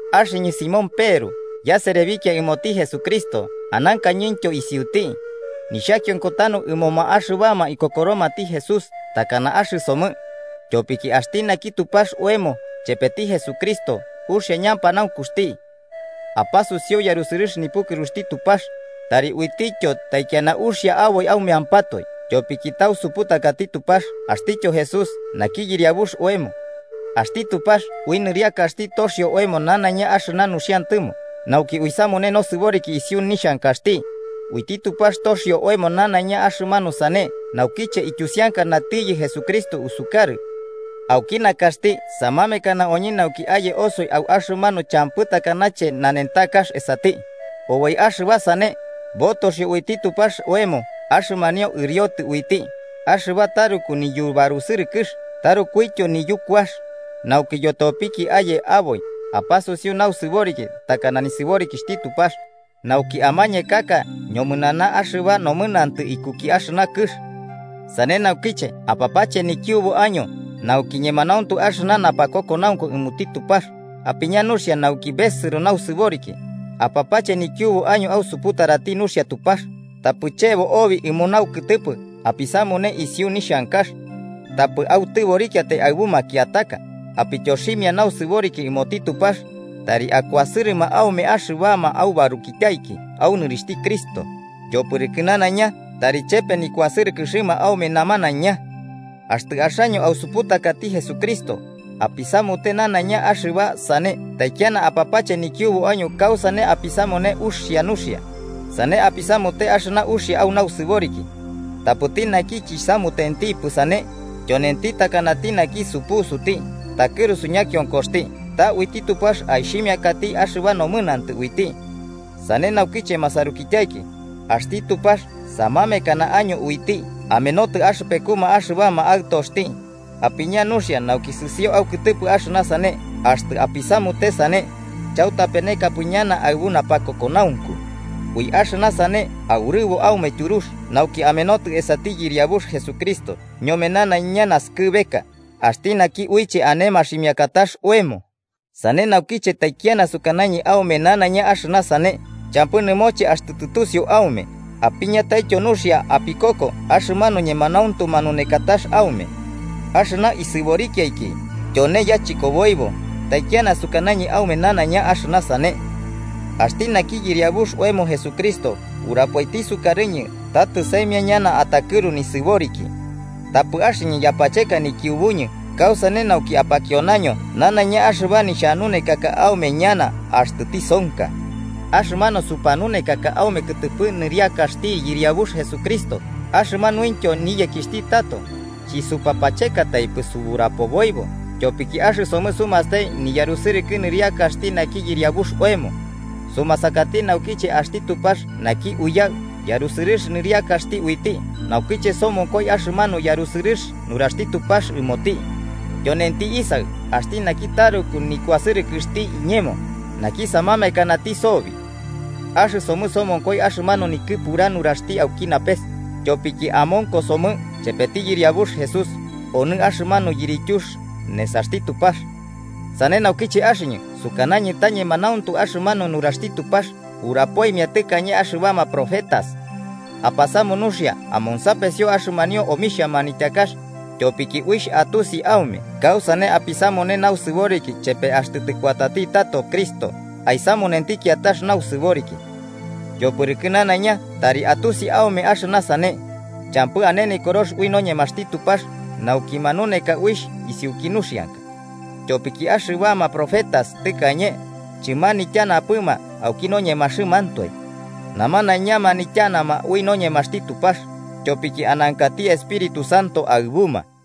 Axɨñɨ Simón Peru yaserebikia ɨmoti Jesucristo anankañɨntyo isiuti, nixhakionko tanu ɨmoma axɨbama ikokoromati Jesús takana axɨsomɨ, tyopiki axti naki Tupax oemo chepeti Jesucristo uxia ñapanaunkuxti. Apasusiu yarusɨrɨx nipukɨruxti Tupax, tari uitityo taikiana uxia aboi aumeampatoe tyopiki tausuputakati Tupax axtityo Jesús naki Yɨriabux oemo. Axti Tupax ui nɨriakaxti toxio oemo nanaiña axɨna nuxiantɨmo, nauki uisamune nosɨboriki isiu nixhankaxti. Uiti Tupax atoxi oemo nanaiña axɨmanu sane naukiche iyusianakanatiyɨ Jesucristo usukarɨ. Auki nakaxti samamekana oñɨ nauki aye osoi au axɨmanu champɨ takanache nanentakax esati. Oboi axɨba sane botoxio uiti Tupax oemo axɨmanio ɨriotɨ uiti, axɨba taruku niyubarusɨrɨkɨx tarukuityo niyukuax, nauki yotopiki aye aboi apasuriu nausɨboriki takana nisɨborikixhti Tupax nauki amañekaka ñomɨnana axɨba nomɨnantɨ ikuki axɨna kɨx. Sane naukiche apapache nikiubu año nauki ñemanauntu axɨna napakokonaunku ɨmoti Tupax, apiña nuxia nauki besɨro nausɨboriki, apapache nikiubu año ausuputarati nuxia Tupax, tapɨ chebo oboi ɨmo naukɨtɨpɨ apisamune isiu nixhankax. Tapɨ autɨborikiatai aɨbu makiataka, apityoximia nausɨboriki ɨmoti Tupax, tari akuasɨrɨma aume axɨbama aubarukityaiki au nɨrixhti Cristo, yopɨrɨkɨ nanaiña tari chepe nikuasɨrɨkɨxɨma aume namanaiña. Axtɨ axaño ausuputakati Jesucristo, apisamute nanaiña axɨba sane taikiana apapache nikiubu año kausane apisamune uxia nuxia. Sane apisamute axɨna uxia au nausɨboriki. Tapɨti naki chisamutentipɨ sane, tyonenti takanati naki supusuti, takɨrusu ñakionkoxti ta uiti Tupax aixhimiakati axɨba nomɨnantɨ uiti. Sane naukiche masarukityaiki, axti Tupax samamekana año uiti amenotɨ axɨpekuma axɨbama aɨtoxti, apiña nuxia nauki sɨsio aukɨtɨpɨ axɨna sane, axtɨ apisamute sane, chautapenekapɨ ñana aɨbu napakokonaunku. Ui axɨna sane aurɨbo aume tyurux nauki amenotɨ esati Yɨriabux Jesucristo ñome nanaiña naskɨbeka axti naki uiche ane maximiakatax oemo. Sane naukiche taikiana sukanañɨ aume nanaiña axɨna sane, champɨ nɨmoche axtɨ tɨtusiu aume apiñataityo nuxia apikoko axɨmanu ñemanauntu manunekatax aume. Axɨna isɨborikiaiki, tyone yachɨkoboibo taikiana sukanañɨ aume nanaiña axɨna sane. Axti naki Yɨriabux oemo Jesucristo urapoiti sukarɨñɨ ta tɨsaimia ñana atakɨru nisɨboriki. Tapɨ axɨñɨ yapacheka nikiubuñɨ kausane nauki apakionaño nanaiña axɨba nixhanunekaka aume ñana axtɨ tisonka. Axɨmanu supanunekaka aume kɨtɨpɨ nɨriakaxti Yɨriabux Jesucristo axɨmanuintyo niyekixhti tato, chɨsupapachekataipɨ suburapoboibo, tyopiki axɨsomɨ sumastai niyarusɨrɨkɨ nɨriakaxti naki Yɨriabux oemo. Sumasakati naukiche axti Tupax naki Uyaɨ yarusɨrɨx nɨrixhti uiti, naukiche somonkoi axɨmanu yarusɨrɨx nuraxti Tupax ɨmoti: “Tyonenti Isaɨ axti naki taruku nikuasɨrɨkɨxti iñemo, naki samamekanati sobi.” Axɨsomɨ somonkoi axɨmanu nikɨpura nuraxti auki napes, tyopiki amonkosomɨ chepeti Yɨriabux Jesús onɨ axɨmanu yirityux nesaxti Tupax. Sane naukiche axɨñɨ sukanañɨ ta ñemanauntu axɨmanu nuraxti Tupax urapoimia tɨkañe axɨbama profetas. Apasamu nuxia amonsapesio axɨmanio omixhia manityakax, tyopiki uixh atusi aume kausane apisamune nausɨboriki chepe axtɨ tɨkuatati tato Cristo aisamunenti kiatax nausɨboriki. Yopɨrɨkɨ nanaiña tari atusi aume axɨna sane: champɨ ane Nikorox ui noñemaxti Tupax nauki manuneka uixh isiuki nuxianka. Tyopiki axɨbama profetas tɨkañe, chɨmanityanapɨma auki noñemaxɨmantoe. Namanaiña manityanama ui noñemaxti Tupax, tyopiki anankati Espíritu Santo aɨbuma.